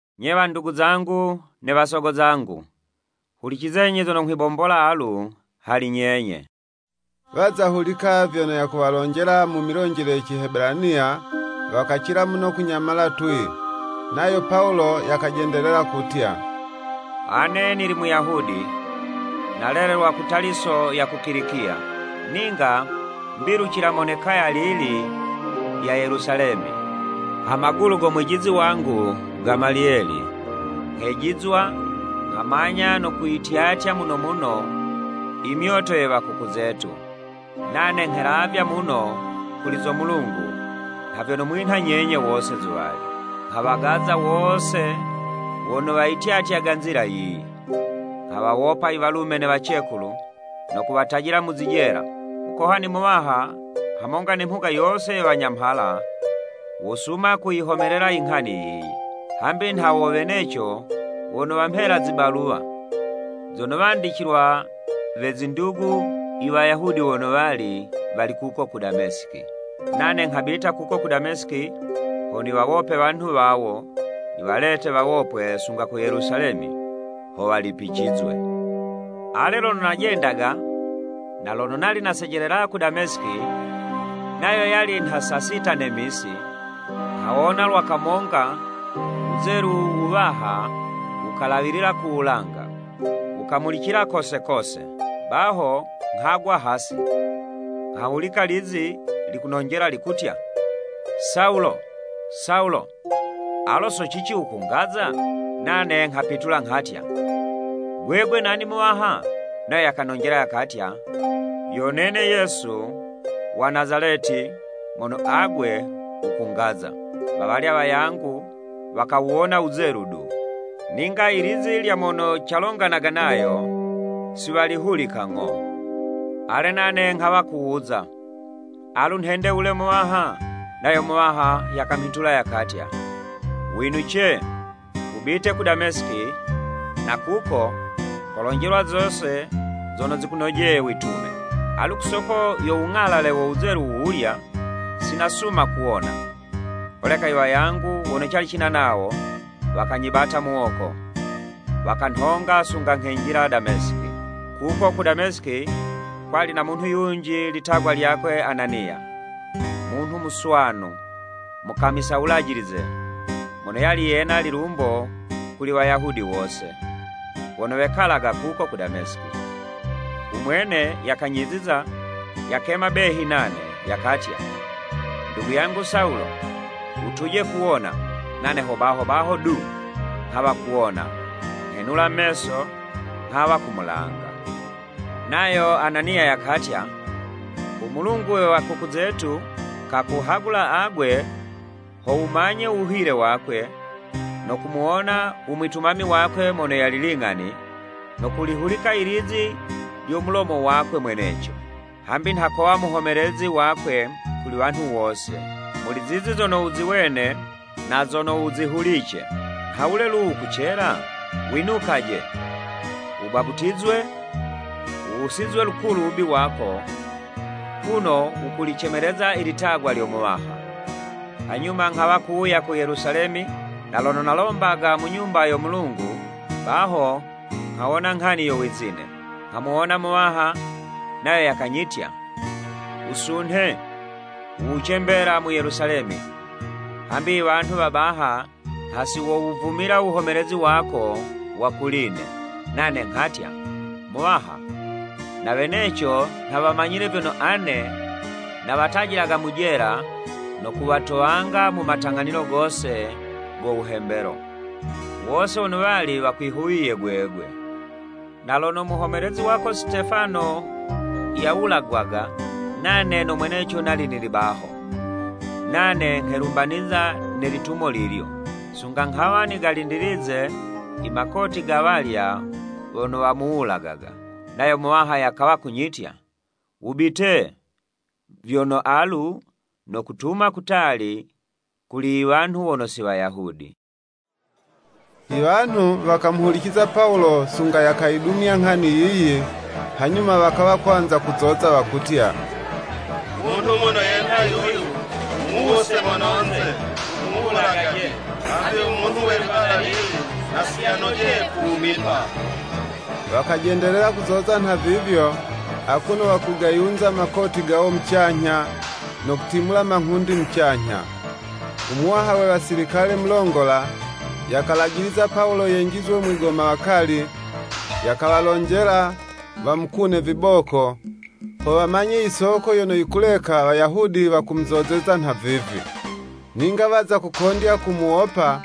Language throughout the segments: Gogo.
“Nye wandugu zangu ne wasogo zangu, hulicizenyi zono nghwibombola alu hali nyenye!” Waza hulika vyono yakuwalonjela mu milonjele ye Cihebelaniya, wakacila muno kunyamala twii. Nayo Pawulo yakajendelela kutya, “Ane nili Muyahudi, nalelelwa ku Taliso ya ku Kilikiya, ninga mbilucila mone kaya lili lya Yelusalemi, ha magulu go mwijizi wangu Gamaliyeli, nghejizwa, nghamanya no kuyityatya muno muno imyoto ye wakuku zetu, nane nghelavya muno kuli zo Mulungu nha vyono mwinha nyenye wose zuwali. Nghawagaza wose wono wayityatyaga Nzila yiyi. Nghawawopa iwalume ne wacekulu no kuwatajila mu zijela. U Mukohani Muwaha, hamonga ne mhuga yose ye Wanyamhala, wosuma kuyihomelela inghani yiyi. Hambi nha wo weneco wono wamhela zibaluwa, zono wandicilwa we zindugu i Wayahudi wono wali, wali kuko ku Damesiki. Nane nghabita kuko ku Damesiki, ho niwawope wanhu wawo, niwalete wawopwe sunga ku Yelusalemi, ho walipicizwe. “Ale, lono najendaga, na lono nali nasejelela ku Damesiki, nayo yali nha saa sita ne misi, nghawona lwa kamonga wuzelu wuwaha wukalawilila ku wulanga, wukamulicila kose kose. Baho nghagwa hasi, nghahulika lizi likunonjela likutya, ‘Sawulo, Sawulo, alo so cici wukungaza?’ Nane nghapitula nghatya, ‘Gwegwe nani Muwaha?’ Nayo yakanonjela yakatya, ‘Yo nene Yesu wa Nazaleti mono agwe wukungaza.’ Wawalya wayangu wakawuwona uwuzelu du, ninga ilizi lya mono calonganaga nayo, si walihulika ng'o. Ale nane nghawa kuwuza, ‘Alu nhende wule Muwaha?’ Nayo Muwaha yakamhitula yakatya, ‘Winuce wubite ku Damesiki, na kuko, kolonjelwa zose zono zikunojeye witume.’ Alu, ku soko yo wung'alale wo wuzelu wuwulya, si nasuma kuwona, holeka iwayangu wono cali cina nawo, wakanyibata muwoko, wakanhonga sunga nghenjila Damesiki. “Kuko ku Damesiki kwali na munhu yunji litagwa lyakwe Ananiya, munhu muswanu, mukamisa wulajilize, mono yali yena lilumbo kuli Wayahudi wose, wono wekalaga kuko ku Damesiki. Umwene yakanyiziza, yakema behi nane, yakatya, ‘Ndugu yangu Sawulo, wutuje kuwona.’ Nane ho baho baho du, nghawa kuwona, nghenula meso, nghawa kumulanga. Nayo Ananiya yakatya, ‘U Mulungu we wakuku zetu, kakuhagula agwe, ho wumanye u wuhile wakwe, no kumuwona u mwitumami wakwe Mono Yali Ling'ani, no kulihulika ilizi lya mu mulomo wakwe mweneco. Hambi nha kowa muhomelezi wakwe kuli wanhu wose, muli zizi zono wuziwene, na zono wuzihulice. Nhawule lu wukucela? Winukaje, wubaputizwe wuwusizwe lukulu uwubi wako, kuno wukulicemeleza ilitagwa lyo Muwaha.’ “Hanyuma nghawa kuwuya ku Yelusalemi, na lono nalombaga mu Nyumba yo Mulungu, baho nghawona nghani yo wizine. Nghamuwona Muwaha, nayo yakanyitya, ‘Wusunhe, wuwuce mbela mu Yelusalemi, hambi iwanhu wa baha, nha si wowuvumila wuhomelezi wako wa kuli'ne.’ Nane nghatya, ‘Muwaha, na weneco nha wamanyile vyono ane nawatajilaga mu jela no kuwatowanga mu matang'anilo gose go wuhembelo, wose wono wali wakwihuwiye gwegwe. Na lono muhomelezi wako Sitefano yawulagwaga, nane no mweneco nali nili baho, nane nghelumbaniza ne litumo lilyo, sunga nghawa nigalindilize imakoti ga walya wono wamuwulagaga.’ Nayo Muwaha yakawa kunyitya, ‘Wubite, vyono alu, nokutuma kutali kuli i wanhu wono si Wayahudi.’” Iwanhu wakamuhuliciza Pawulo sunga yakayidumya nghani yiyi, hanyuma wakawa kwanza kuzoza wakutya, “Munhu mono yenha yuyu, mumuwuse mononze, mumuwulagaje, hambi u munhu we liwala lili, nha si yanojeye kuwumipa.” Wakajendelela kuzoza nhavivyo, akuno wakugayunza makoti gawo mucanyha, no kutimula manghundi mucanyha. Umuwaha we wasilikale mulongola, yakalajiliza Pawulo yenjizwe mwigomawakali, yakawalonjela, wamukune viboko, ho wamanye yisoko yono yikuleka Wayahudi wakumuzozeza nhavivi. Ninga waza kukondya ku muwopa,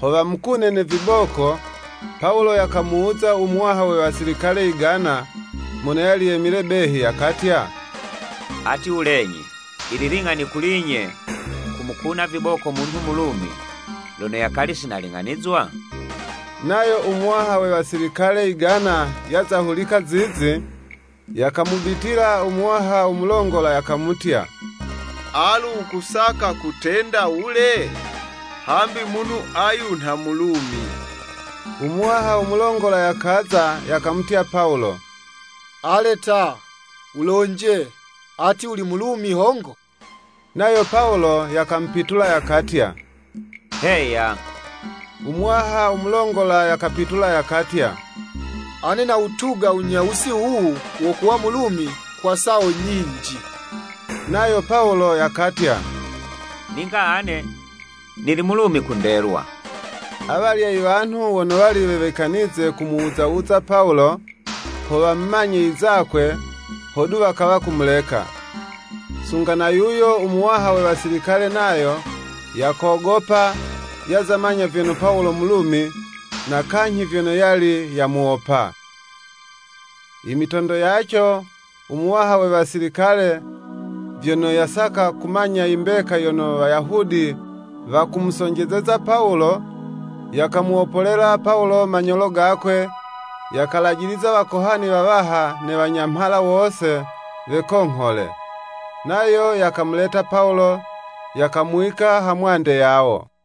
ho wamukune, ne viboko, Pawulo yakamuwuza u muwaha we wasilikale yigana, mono yali yemile behi yakatya, “Ati, wulenyi, yili ling'ani kuli'nye, kumukuna viboko munhu Mulumi, lono yakali sinaling'anizwa?” Nayo u muwaha we wasilikale yigana yaza hulika zizi, yakamubitila u muwaha u mulongola yakamutya, “Alu wukusaka kutenda wule? Hambi munhu ayu nha Mulumi!” Umuwaha u mulongola yakaza, yakamutya Pawulo, “Ale ta, wulonje, ati wuli Mulumi hongo?” Nayo Pawulo yakamupitula, yakatya “Heya.” U muwaha u mulongola yakapitula yakatya “Ane nawutuga wunyawusi wuwu wo kuwa Mulumi kwa sawo nyinji.” Nayo Pawulo yakatya, “Ninga ane nili Mulumi ku ndelwa.” Awalya iwanhu wono wali wewikanize kumuwuza wuza Pawulo, ho wamumanye izakwe, hodu wakawa kumuleka. Sunga na yuyo u muwaha we wasilikale nayo, yakogopa, yaza manya vyono Pawulo Mulumi, na kanyhi vyono yali yamuwopa. Imitondo yaco, u muwaha we wasilikale, vyono yasaka kumanya i mbeka yono Wayahudi wakumusonjezeza Pawulo, yakamuwopolela Pawulo manyolo gakwe, yakalajiliza wakohani wawaha ne wanyamhala wose wekonghole. Nayo yakamuleta Pawulo, yakamuwika ha mwande yawo.